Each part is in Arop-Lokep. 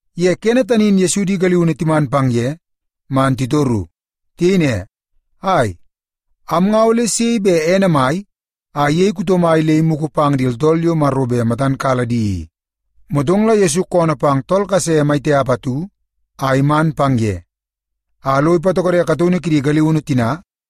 Ye kene tani in Yesu di galiunu timan pang ye man titoru. Tiyei ne, “Ai, am nga ole sei bet ene mai a iyei kuto mai le imugu pang di tooltool yo Maro bet matan kala di i?” Motong la Yesu koonoo pang tool kase mai tiap atu a iman pang ye, a lo ipatokode kataunu kidi galiunu tina,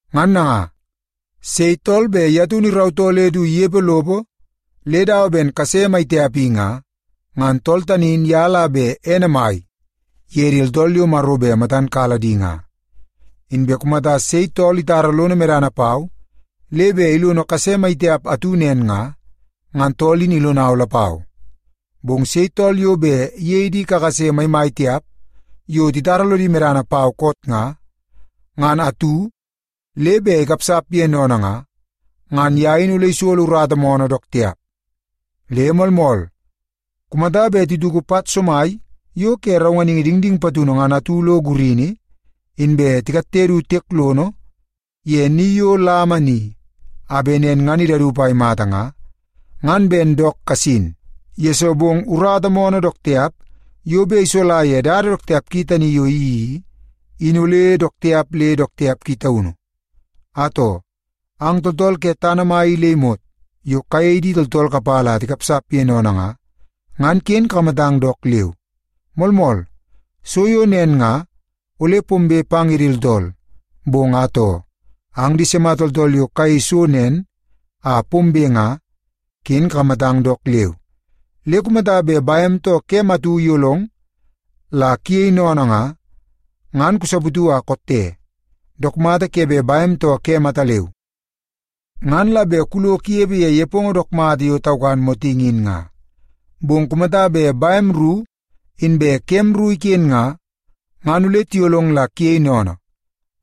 Ngan nanga, sei tool bet ye taunu irautoo le du inepe lopo le dawa ben kase mai tiap i nga, ngan tool tani in ye la bet ene mai ye di tooltool yo Maro bet matan kala di nga. “Inbe kumata bet sei tool itara lono medana pau le bet ilono tool kase mai tiap atu nen nga, ngan tool in ilonau lapau. Bong sei tool yo bet iyei di kakase maimai tiap yo titara lodi medana pau koot nga, ngan atu, le bet ikapsap ye sennene nga, ngan ye in ole isolo urata moonoo dook tiap. Le moolmool, kumata bet tituku pat somai yo ke raunganingi dingding patunu ngan atu lo gurini, inbe tikatte du tiek lono ye ni yo lama ni a bet nen ngan idaup a imata nga, ngan ben dook kasin, yesoo bong urata moonoo dook tiap yo bet isola ye dada dook tiap ki tani yo iyeii i, in ole dook tiap le dook tiap ki taunu. “Atoo, ang tooltool ke tana mai i le imot yo kayei di tooltool kapala a tikapsap ye sennene nga, ngan ken kakamatang dook leu! Moolmool, so yo nen nga, ole pombe pang ye di tooltool, bong atoo, ang sima tooltool yo kayei so nen a pombe nga, ken kakamatang dook leu! Le kumata bet bem too kem atu iyolong la kuyei sennene nga, ngan kusaputu a kotte. Dook mata ke bet bem too kem ataleu, ngan la bet kulo kunepe ye nepongo dook mata yo taukan motingi in nga. Bong kumata bet bem ru inbe kem ru iken nga, ngan ole tiyolong la kuyei sennene,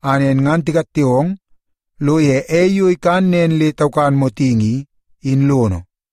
a nen ngan tikatte ong lo ei yo ikan nen le taukan motingi i, in lono.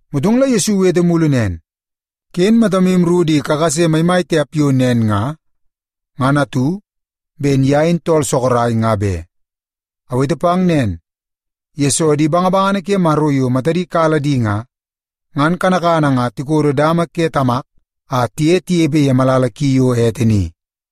Motong la Yesu iwete mulu nen, “Ken matamu ru di kakase maimai tiap yo nen nga, ngan atu, ben ye in tool sorok, nga be. Awete pang nen, yesoo di bangabangana ke Maro yo matadi kala di nga, ngan kanakana nga tikodo dama ke Tamak a tiye tinepe ye malala ki yo ete ni.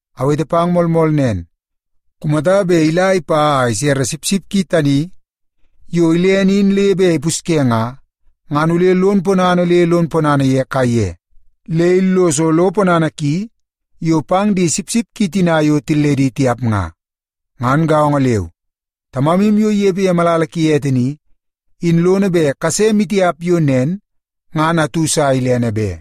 Awete pang moolmool nen, kumata bet ila ipa a isere sipsip ki tani yo ilene in le bet ipusye nga, ngan ole lon ponana le lon ponana ye kaiye, le illoso lo ponana ki yo pang di sipsip ki tina yo tilledi tiap nga. Ngan gaongo leu, Tamamu yo inepe ye malala ki ete ni, in lono bet kase maitiap yo nen ngan atu sa ilene be.”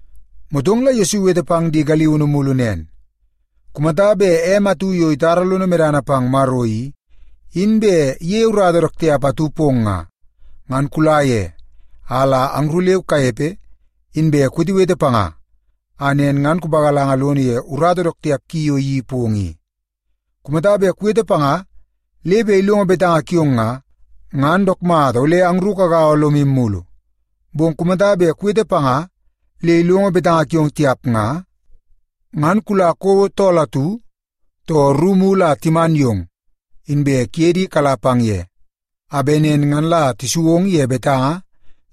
Motong la Yesu iwete pang di galiunu mulu nen, “Kumata bet em atu yo itara lono medana pang Maro i, in bet iyeie urata dook tiap atu pong nga, ngan kula ye a la angru leu kanepe, inbe kuwetewete panga a nen ngan kupagalanga lono ye urata dook tiap ki yo iyeii pong i. Kumata bet kuwete panga le bet ilongo betanga kiong nga, ngan dook mata ole angru kagaua lomu mulu. Bong kumata bet kuwete panga le ilongo betanga kiong tiap nga, ngan kula kouo tool atu too ru mulu a timan yong, inbe kuye di kala pang ye, a bet nen ngan la tisu ong ye betanga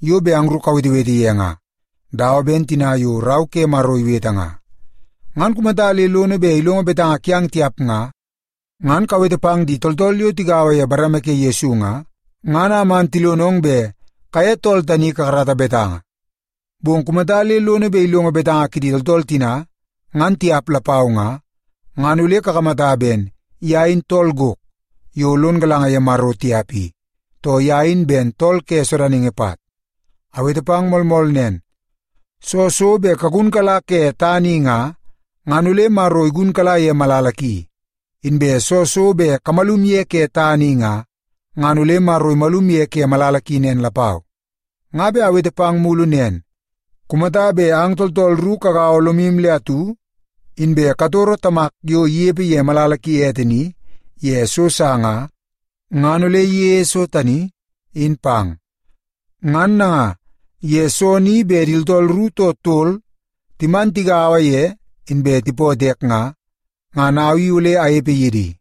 yo bet angru kawetewete ye nga, dawa ben tina yo Rau ke Maro iwete nga. Ngan kumata le lono bet ilongo betanga kiang tiap nga, ngan kawete pang di tooltool yo tigaua ye bareme ke Yesu nga, ngan a man tilonong bet kaye tool tani kakarata betanga. Bong kumata le lono bet ilongo betanga kidi tooltool tina, ngan tiap lapau nga, ngan ole kakamata ben ye in tool gok yo lon galanga ye Maro tiap i, too ye in ben tool ke sodaningi pat. “Awete pang moolmool nen, soo so bet kugunkala ke tana i nga, ngan ole Maro igunkala ye malala ki. Inbe soo so bet kumalum ye ke tana i nga, ngan ole Maro imalum ye ke malala ki nen lapau. “Nga bet awete pang mulu nen. Kumata bet ang tooltool ru kagaua lomu le atu, inbe katoro Tamak yo inepe ye malala ki ete ni ye so sa nga, ngan ole iyeie so tani, in pang. Ngan nanga, ye soo ni bet di tooltool ru too tol timan tigaua ye inbe tipootoo ek nga, ngan au i ole anepe ye di.”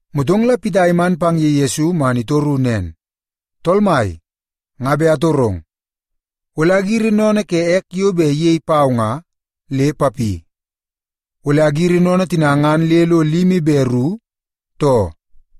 Motong la Pita iman pang ye Yesu man itoru nen, “Tool Mai, nga bet atorong. Ole agiri sennene ke ek yo bet iyei pau nga, le papi? Ole agiri sennene tina ngan le lo limi be ru, too?”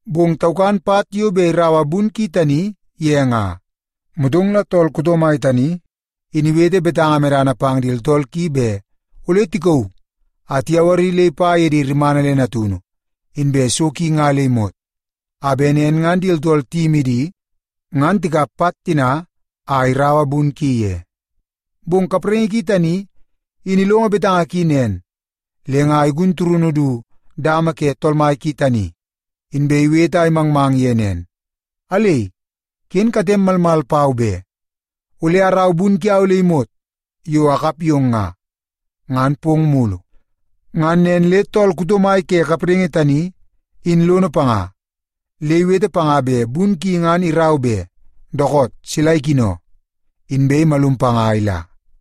Bong taukan pat yo bet iraua bun ki tani ye nga. Motong la tool kuto mai tani in iwete betanga medana pang di tooltool ki bet ole tikauu a tiyawari le ipa ye rimana le di natunu inbe so ki nga le imot, a bet di tooltool tiyimi di, ngan tikap pat tina a tiraua bun ki ye. “Bong kapraingi ki tani in ilongo betanga ki nen, le nga igun turunu du dama ke tool mai tani, inbe iwete a imangmang ye nen, ‘Alei, ken katem malmal pau be! Ole arau bun kiau le imot yo akap yong nga, ngan pong mulu.’ Ngan nen le tool kuto mai ke kapraingi tani in lono panga, le iwete panga bet bun ki ngan irau be. Dookoot, sila ikino. Inbe imalum panga a ila.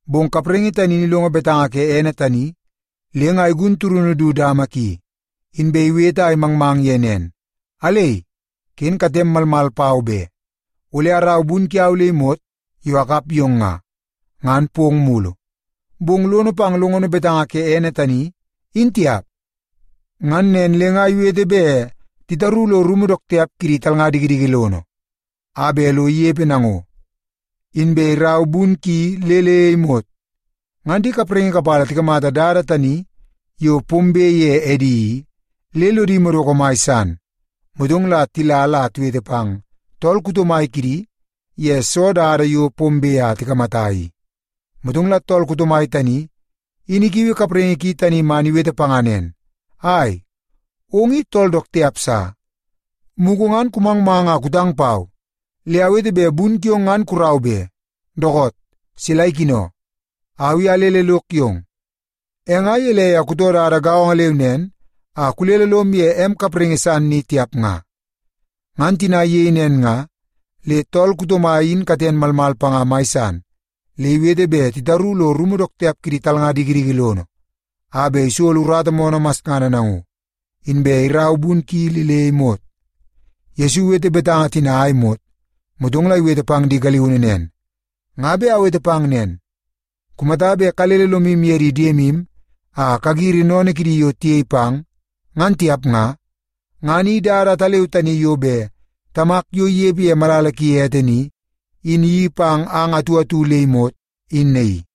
“Bong kapraingi tani in ilongo betanga ke ene tani, le nga igun turunu du dama ki, inbe iwete a imangmang ye nen, ‘Alei, ken katem malmal pau be! Ole arau bun kiau le imot yo akap yong nga, ngan pong mulu.’ “Bong lono pang longono betanga ke ene tani, in tiap. Ngan nen le nga iwete bet titaru lo rumu dook tiap kidi talnga dikidiki lono a bet lo inepe nango, inbe irau bun ki le le imot. Ngan di kapraingi kapala tikamata dada tani yo pombe pang ye edi i, le lodi madoko mai san. Motong la tila la tiwete pang tool kuto mai kidi ye soo dada yo pombe a tikamata i. “Motong la tool kuto mai tani, in ikiui kapraingi ki tani man iwete panga nen, ‘Ai, ong i tool dook tiap sa! Mugu ngan kumangmang a kutang pau, le awete bet bun kiong ngan kurau be. Dookoot, sila ikino. Au i alele lok yong, e nga gelei a kutoo dada gaongo leu nen a kulele lom ye em kapraingi san ni tiap nga?’ Ngan tina iyei nen nga, le tool kuto mai in katen malmal panga mai san le iwete bet titaru lo rumu dook tiap kidi talnga dikidiki lono a bet isolo urata masngana nango, inbe irau bun ki le le imot.” Yesu iwete betanga tina a imot, motong la iwete pang di galiunu nen, “Nga bet awete pang nen, kumata bet kalele lomu ye di diemu a kagiri sennene kidi yo tiyei pang, ngan tiap nga, ngan i dada ataleu tani yo bet Tamak yo inepe ye malala ki ete ni, in iyeii pang ang atu atu le imot, in naii.”